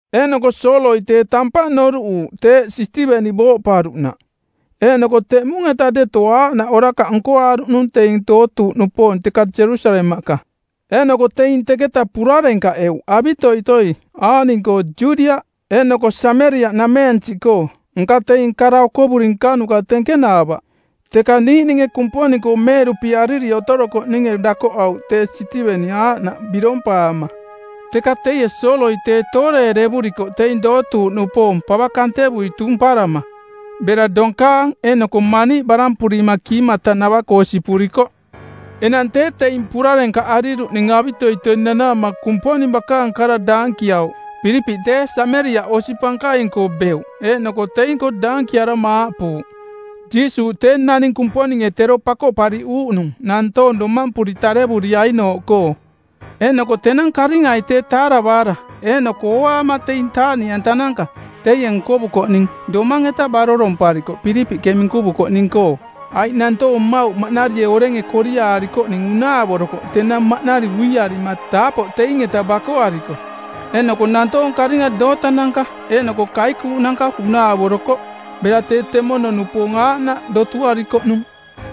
Eeꞌnoko Sooloi tee tampaꞌ noruꞌuuꞌ teeꞌ Sitiveni booꞌparuꞌnaꞌ. Eeꞌnoko teꞌmung-eta deto aaꞌnaꞌ orakaꞌ nkoaaruꞌnung teing dootuuꞌnupoong teka Jerusalemaꞌka, eeꞌnoko teing teketa purarenkaꞌeuꞌ avitoitoi aaꞌning-koo Judiaꞌ eeꞌnoko Sameriaꞌnameensiꞌkoo, nka teing kara okovuri nkanuka tenkenaavaꞌ. Teka niiꞌninge Kumponing-koo meeꞌduꞌpiariri otorokoꞌninge dakoꞌauꞌ tee Sitiveni aaꞌnaꞌ birompaama. Teka teie Sooloi tee tooreerevurikoꞌ teing dootuuꞌnupoong pava kantevui tumparama bera donkaang eeꞌnoko maniiꞌ barampurima kiimatanava-koo sipurikoꞌ. Enang tee teing purarenkaꞌariruꞌning avitoitoi nanaama Kumponing bakaang kara daankiauꞌ. Pilipiꞌ tee Sameriaꞌ osi pankaing-koo beuꞌ eeꞌnoko teing-koo daankiarama aaꞌpuuꞌ, “Jiisuuꞌ tee naning Kumponinge tero Pakoꞌpariꞌuuꞌnung˜ nantoong domampuri tarevuriainooꞌkoo.” Eeꞌnoko tenang karingai tee taaravaara eeꞌnoko ooaama taaꞌniꞌantananka teie nkovukoꞌning domang-eta baroromparikoꞌ Pilipiꞌke minkuvukoꞌning-koo. Aiꞌ nantoong mmauꞌ maꞌnarie orenge koriaarikoꞌning unaavorokoꞌ tenang maꞌnari uiarima taapoꞌ teing-eta bakoariko, eeꞌnoko nantoong karinga dootananka eeꞌnoko kaikuuꞌnanka unaavorokoꞌ. Bera tee temono-nupoong aaꞌnaꞌ dotuarikoꞌnung.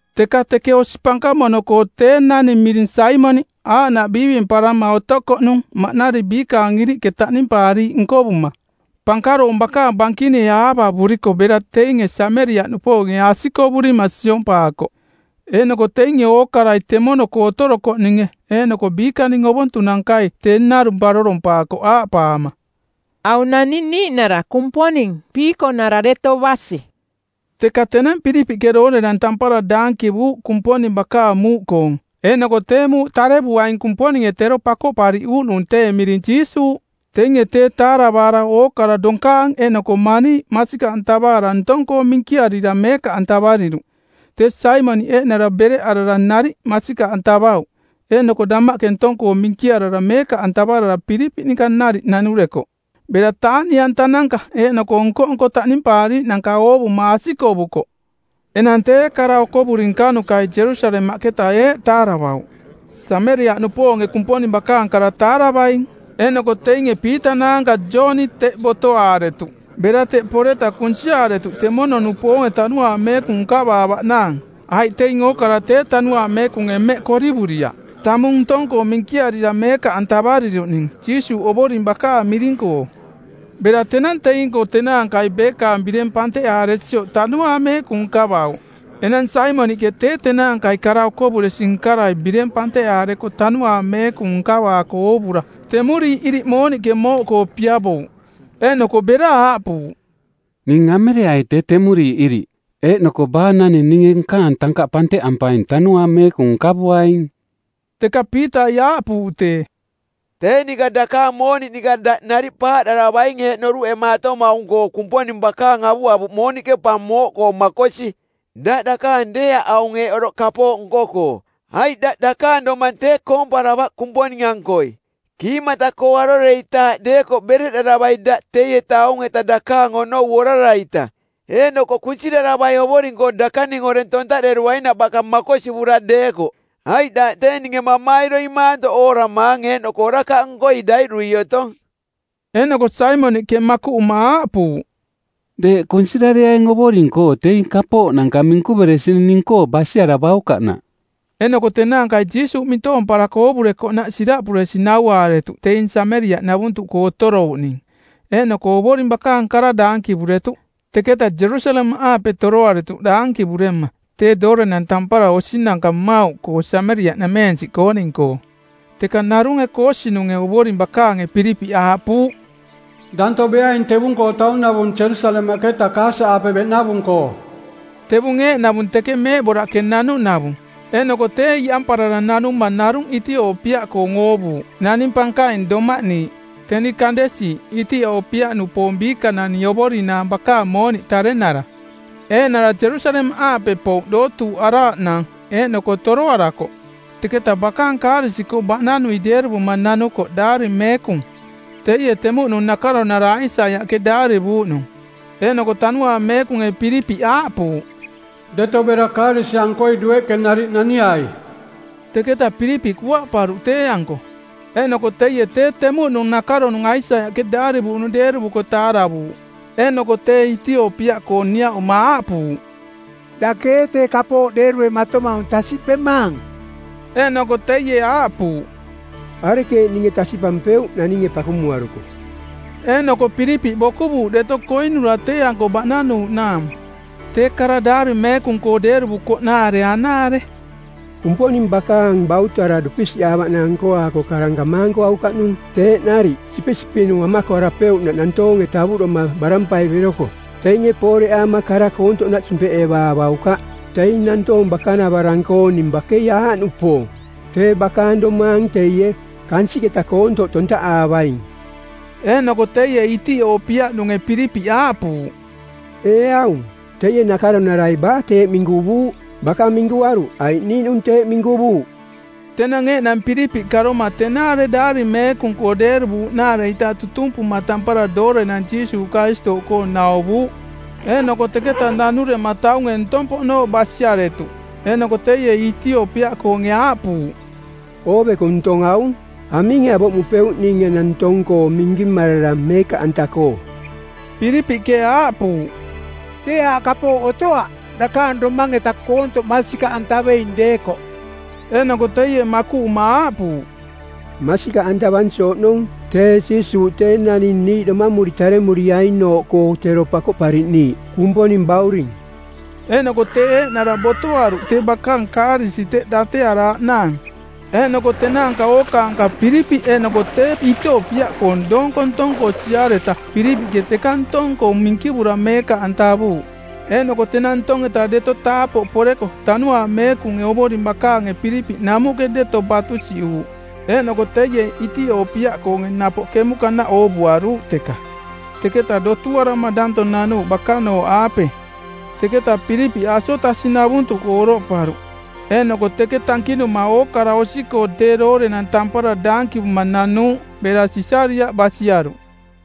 Teka teke osi pankamono-koo tee naning miring Saimoniꞌ aaꞌnaꞌ biivimparama otokoꞌnung maꞌnari biikaang iriꞌke taꞌnimpaariiꞌ nkovuma. Pankaroong bakaang bankinie aavavuriko bera teinge Sameriaꞌnupoonge asikovurima siompaakoꞌ; Eeꞌnoko teinge ookarai temono-koo otorokoꞌninge eeꞌnoko biikaning ovontunankai tee narung barorompaakoꞌ aaꞌpaama, “Aung naning niiꞌnara Kumponing piikonara deto basi.” Teka tenang Pilipiꞌke doorenang tampara daankivuuꞌ Kumponing bakaang muuꞌkoong eeꞌnoko tee muuꞌ tarevuaing Kumponinge tero Pakoꞌpariꞌuuꞌnung tee miring Jiisuuꞌ. Teinge tee taaravaara ookara, donkaang eeꞌnoko maniiꞌ masikaꞌantavaara ntong-koo minkiarira meekaꞌantavariruꞌ. Tee Saimoniꞌ eeꞌnara bereꞌarara nariꞌ masikaꞌantavauꞌ, eeꞌnoko damaꞌke ntong-koo minkiarara meekaꞌantavarara Pilipiꞌ ninka nariꞌ nanurekoꞌ, bera taaꞌniꞌantananka eeꞌnoko nko-nko taꞌnimpaariiꞌnanka oovuma asikovukoꞌ. Enang tee kara okovuri nkanukai Jerusalemaꞌketa eeꞌ taaravauꞌ, “Sameriaꞌnupoonge Kumponing bakaang kara taaravaing.” Eeꞌnoko teinge Piita naanka Jooni teꞌ botoaaretuꞌ. Bera teꞌ poreta kunsiaaretuꞌ temono-nupoonge Tanuaang Meekung nkavaavaꞌnaang. Aiꞌ teing ookara tee Tanuaang Meekunge mmeꞌ korivuriaꞌ, tamung ntong-koo minkiarira meekaꞌantavariruꞌning Jiisuuꞌ Ovoring bakaang miring-koo. Bera tenang teing-koo tenaankai beekaang bireng panteꞌaaresioꞌ Tanuaang Meekung nkavauꞌ. Enang Saimoniꞌke tee tenaankai kara-okovuresi-nkarai bireng panteꞌaareko Tanuaang Meekung nkavaako oovura, temuriiꞌ iriꞌ mooniꞌke mooꞌkoo piavouꞌ. Eeꞌnoko bera aaꞌpuuꞌ, “Ning amereai tee temuriiꞌ iriꞌ, eeꞌnoko baa naning ninge nkaang tankaꞌ panteꞌampaing Tanuaang Meekung nkavuaing.” Teka Piitai aaꞌpuuꞌ tee, “Tee ninka dakaang mooniꞌ ninka daꞌ nariꞌ paaꞌdaravaing eeꞌ noruꞌemaatomaung-koo Kumponing bakaang avuavuꞌ mooniꞌke pa mooꞌkoo makosi. Daꞌ dakaang deeaꞌ aung eeꞌ oroꞌ kapooꞌ nko-koo, aiꞌ daꞌ dakaang domang tee koomparavaꞌ Kumponing-ankoi. Kiimata-koo aroreitaaꞌ deekoꞌ bereꞌdaravai daꞌ teieta aung-eta dakaang onou orara-ita, eeꞌnoko kunsiraravai Ovoring-koo dakaning oreng tontaꞌderuainaꞌ baka makosivura deekoꞌ. Aiꞌ daꞌ tee ninge mamairoi maantoꞌ ooramaang eeꞌnoko orakaꞌnkoi daiꞌdui otong.” Eeꞌnoko Saimoniꞌke makuꞌuma aaꞌpuuꞌ, “Deeꞌ kunsirareaing Ovoring-koo teing kapooꞌnanka minkuveresining ning-koo basiaravaukaꞌnaꞌ.” Eeꞌnoko tenaankai Jiisuuꞌ mintoomparako oovurekoꞌnaꞌ siraꞌpuresi nauaaretuꞌ teing Sameriaꞌnavuntuꞌkoo otorouꞌning, eeꞌnoko Ovoring bakaang kara daankivuretuꞌ. Teketa Jerusalemaꞌaape toroaretuꞌ daankivurema tee doorenang tampara osinanka mmauꞌkoo Sameriaꞌnameensiꞌkooning-koo. Teka narunge koosinunge˜ Ovoring bakaange Pilipiꞌ aaꞌpuuꞌ, “Danto beaing tevung-koo taunavung Jerusalemaꞌketa Kasa-aape beꞌnavung-koo.” Tevung eeꞌnavung teke meeꞌboraꞌke nanuꞌnavung. Eeꞌnoko tee iꞌamparara nanuma narung Itiopiaꞌkoong oovuuꞌ, naning pankaing, doꞌmaꞌniiꞌ, teni Kandesi, Itiopiaꞌnupoong biikanani ovorinaang bakaang mooniꞌ tarenara; Eeꞌnara Jerusalemaꞌaape pouꞌ dootuuꞌaraaꞌnaang eeꞌnoko toroarakoꞌ teketaꞌ bakaang kaarisi-koo baꞌnanui deeruvuma nanukoꞌ Daari Meekung teie temuꞌnung nakaronarai Aisaiaꞌke daarivuuꞌnung. Eeꞌnoko Tanuaang Meekunge Pilipiꞌ aaꞌpuuꞌ, “Deto bera kaarisi-ankoi dueꞌke nariꞌ naniai.” Teketa Pilipiꞌ kuaꞌparuꞌ tee-anko eeꞌnoko teie tee temuꞌnung nakaronung Aisaiaꞌke daarivuuꞌnung deeruvuko taaravuuꞌ. Eeꞌnoko tee Itiopiaꞌkoong niaꞌuma aaꞌpuuꞌ, “Dake ee tee kapooꞌ deeruematomaung tasiꞌpemaang?” Eeꞌnoko teie aaꞌpuuꞌ, “Arekeeꞌ ninge tasiꞌpampeuꞌ naninge pakumuaruko?” Eeꞌnoko Pilipiꞌ bokuvuuꞌ deto koinura tee-anko baꞌnanuuꞌnaang. Tee kara Daari Meekung-koo deeruvukoꞌnaare anaare: “Kumponing bakaang bautara dupisiꞌaavaꞌnaang nkoaako karang kamaankuaukaꞌnung teeꞌ nariꞌ sipisipiꞌnu amakoarapeuꞌnaꞌ nantoonge tavuꞌdoma barampai beroko. “Teinge pooreꞌaama kara koontoꞌnaꞌ simpeꞌevaavaukaꞌ. Teing nantoong bakanavarang-kooning bakei aaꞌnupoong: tee bakaang domaang teie, kansiꞌketa koontoꞌ tontaꞌaavaing.” Eeꞌnoko teie Itiopiaꞌnunge Pilipiꞌ aaꞌpuuꞌ, “Ee aung, teie nakaronarai baa teeꞌ minkuvuuꞌ? Baka minkuaruꞌ aiꞌ niiꞌnung teeꞌ minkuvuuꞌ?” Tenang eeꞌnang Pilipiꞌ karoma tenaare Daari Meekung-koong deeruvuuꞌnaare-ita tutumpuma tampara doorenang Jiisuuꞌ Karistooꞌkoong nauvuuꞌ. Eeꞌnoko teketa nanurema taunge ntong-poꞌnooꞌ basiaretuꞌ. Eeꞌnoko teie Itiopiaꞌkoonge aaꞌpuuꞌ, “Ooveko ntong aung. Aminge avoꞌmupeuꞌ ning enang ntong-koo minkimarara meekaꞌanta-koo?” Pilipiꞌke aaꞌpuuꞌ, “Tee aaꞌ kapooꞌ otoaꞌ, dakaang domang-eta koontoꞌ masikaꞌantaveing deekoꞌ.” Eeꞌnoko teie makuꞌuma aaꞌpuuꞌ, “Masikaꞌantavansi oꞌnong tee Jiisuuꞌ tee naning niiꞌ domamuri taremuriainooꞌkoo tero Pakoꞌpariꞌniiꞌ, Kumponing Bauring.” Eeꞌnoko tee eeꞌnara botoaruꞌ tee bakaang kaarisi teꞌ datearaaꞌnaang, eeꞌnoko tenaanka ookaanka Pilipiꞌ eeꞌnoko tee Itiopiaꞌkoong doonko ntong-koo siareta Pilipiꞌke teka ntong-koo minkivura meekaꞌantavuuꞌ. Eeꞌnoko tenang ntong-eta deto taapoꞌ poreko Tanuaang Meekunge Ovoring bakaange Pilipiꞌ namuꞌke deto batusiꞌuuꞌ, eeꞌnoko teie Itiopiaꞌkoonge napoꞌ kemuꞌkanaꞌ oovuaruuꞌ teka. Teketa dotuarama danto nanuuꞌ bakanooꞌaape. Teketa Pilipiꞌ Asotasi-navuntuꞌkoo oroꞌparuꞌ, eeꞌnoko teke tankinuma ookara osi-koo tee doorenang tampara daankivuma nanuuꞌ bera Sisariaꞌ basiaruꞌ.